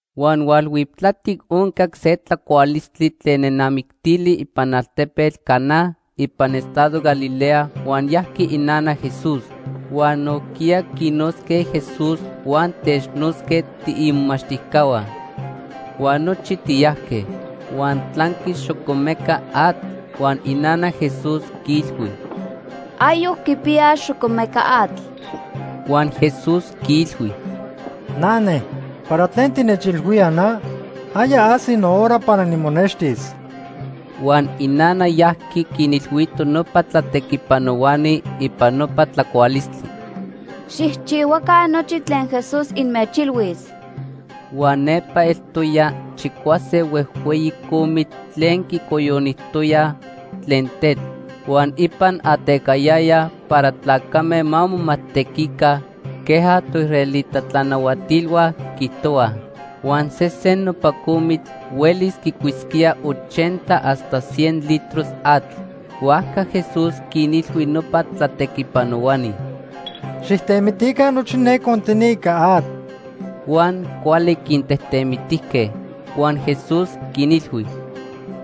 Huan hualhuiptlatic oncac se tlacualistli tlen nenamictili ipan altepetl Caná ipan estado Galilea huan yajqui inana Jesús. Huan nojquiya quinotzque Jesús huan technotzque tiimomachtijcahua. Huan nochi tiyajque. Huan tlanqui xocomeca atl huan inana Jesús quiilhui: ―Ayoc quipiyaj xocomeca atl. Huan Jesús quiilhui: ―Nane, ¿para tlen tinechilhuía na? Aya ajsi nohora para nimonextis. Huan inana yajqui quinilhuito nopa tlatequipanohuani ipan nopa tlacualistli: ―Xijchihuaca nochi tlen Jesús inmechilhuis. Huan nepa eltoya chicuase huejhueyi comitl tlen quicoyonijtoyaj tlen tetl huan ipan atecayayaj para tlacame ma momajtequica queja toisraelita tlanahuatilhua quiijtohuaj. Huan sesen nopa comitl huelis quicuisquía ochenta hasta cien litros atl. Huajca Jesús quinilhui nopa tlatequipanohuani: ―Xijtemitica nochi ne contini ica atl. Huan cuali quintejtemitijque. Huan Jesús quinilhui: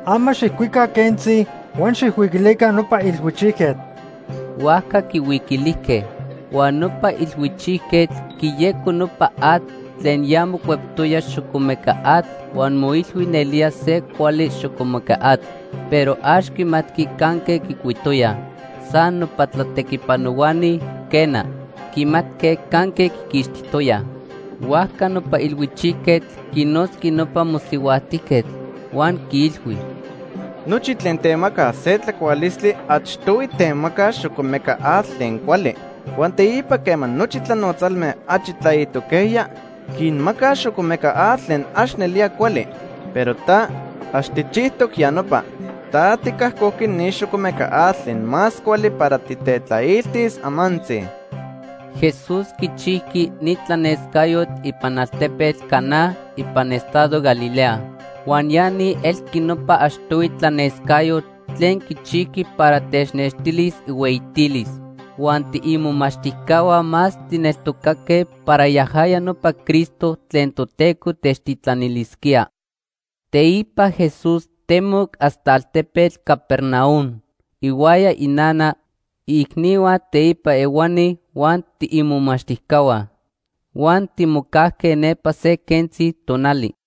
―Ama xijcuica quentzi huan xijhuiquilica nopa ilhuichijquetl. Huajca quihuiquilijque. Huan nopa ilhuichijquetl quiyeco nopa atl tlen ya mocueptoya xocomeca atl huan moilhui nelía se cuali xocomeca atl, pero ax quimatqui canque quicuitoyaj. San nopa tlatequipanohuani, quena, quimatque canque quiquixtijtoyaj. Huajca nopa ilhuichijquetl quinotzqui nopa mosihuajtijquetl, huan quiilhui: ―Nochi tlen temacaj se tlacualistli achtohui temacaj xocomeca atl tlen cuali. Huan teipa quema nochi tlanotzalme achi tlaitoquejya, quinmacaj xocomeca atl tlen ax nelía cuali. Pero ta, ax tijchijtoc ya nopa. Ta ticajcojqui ni xocomeca atl tlen más cuali para titetlailtis amantzi. Jesús quichijqui ni tlanescayotl ipan altepetl Caná ipan estado Galilea. Huan ya ni elqui nopa achtohui tlanescayotl tlen quichijqui para technextilis ihueyitilis. Huan tiimomachtijcahua más tijneltocaque para yajaya nopa Cristo tlen Toteco techtitlanilisquía. Teipa Jesús temoc hasta altepetl Capernaum ihuaya inana, iicnihua teipa ehuani huan tiimomachtijcahua. Huan timocajque nepa se quentzi tonali.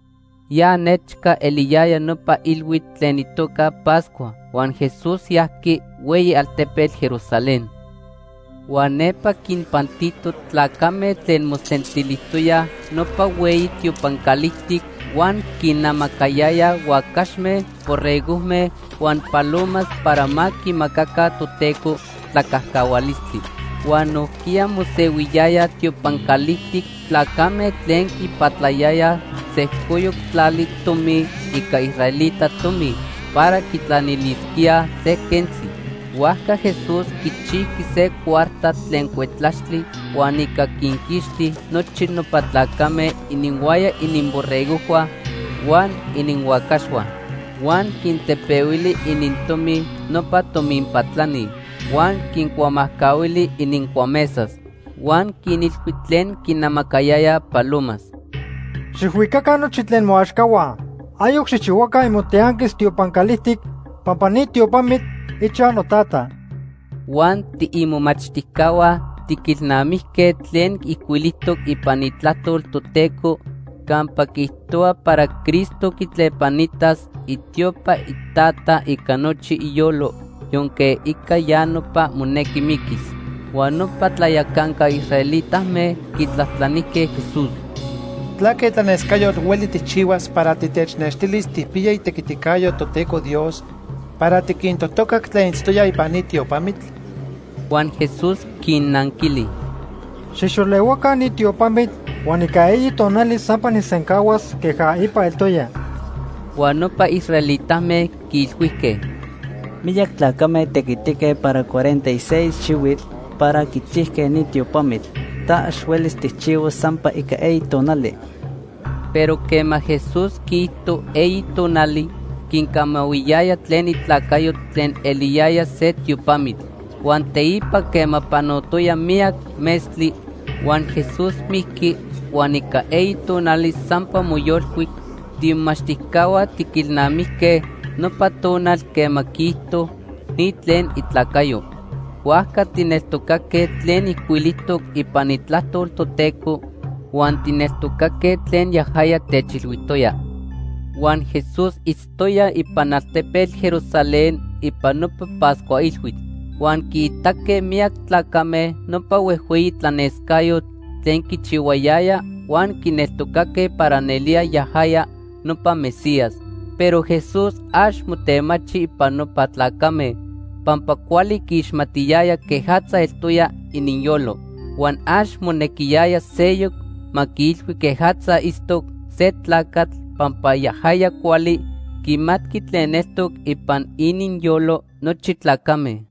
Ya nechca eliyaya nopa ilhuitl tlen itoca Pascua huan Jesús yajqui hueyi altepetl Jerusalén. Huan nepa quinpantito tlacame tlen mosentilijtoyaj nopa hueyi tiopan calijtic huan quinnamacayayaj huacaxme, borregojme huan palomas para ma quimacaca Toteco tlacajcahualistli. Huan nojquiya mosehuiyayaj tiopan calijtic tlacame tlen quipatlayayaj sejcoyoc tlali tomi ica israelita tomi para quitlanilisquíaj se quentzi. Huajca Jesús quichijqui se cuarta tlen cuetlaxtli huan ica quinquixti nochi nopa tlacame ininhuaya ininborregojhua huan ininhuacaxhua. Huan quintepehuili inintomi nopa tomin patlani huan quincuamajcahuili inincuamesas. Huan quinilhui tlen quinamacayayaj palomas: ―Xijhuicaca nochi tlen moaxcahua. Ayoc xijchihuaca imotianquis tiopan calijtic pampa ni tiopamitl ichaj noTata. Huan tiimomachtijcahua tiquilnamijque tlen ijcuilijtoc ipan Itlajtol Toteco campa quiijtohua para Cristo quitlepanitas itiopa iTata ica nochi iyolo, yonque ica ya nopa monequi miquis. Huan nopa tlayacanca israelitame quitlajtlanijque Jesús: ―¿Tlaque tlanescayotl hueli tijchihuas para titechnextilis tijpiya itequiticayo Toteco Dios para tiquintotocac tlen itztoyaj ipan ni tiopamitl? Huan Jesús quinnanquili: ―Xijxolehuaca ni tiopamitl huan ica eyi tonali sampa nijsencahuas queja ipa eltoya. Huan nopa israelitame quiilhuijque: ―Miyac tlacame tequitique para cuarenta y seis xihuitl para quichijque ni tiopamitl; ta ax huelis tijchihuas sampa ica eyi tonali. Pero quema Jesús quiijto eyi tonali, quincamahuiyaya tlen itlacayo tlen eliyaya se tiopamitl. Huan teipa quema panotoya miyac metztli huan Jesús mijqui huan ica eyi tonali sampa moyolcuic, tiimomachtijcahua tiquilnamijque nopa tonal quema quiijto ni tlen itlacayo. Huajca tijneltocaque tlen ijcuilijtoc ipan Itlajtol Toteco huan tijneltocaque tlen yajaya techilhuijtoya. Huan Jesús itztoya ipan altepetl Jerusalén ipan nopa Pascua Ilhuitl. Huan quiitaque miyac tlacame nopa huejhueyi tlanescayotl tlen quichihuayaya huan quineltocaque para nelía yajaya nopa Mesías. Pero Jesús ax motemachi ipan nopa tlacame pampa cuali quiixmatiyaya quejatza eltoya ininyolo. Huan ax monequiyaya seyoc ma quiilhui quejatza itztoc se tlacatl pampa yajaya cuali quimatqui tlen eltoc ipan ininyolo nochi tlacame.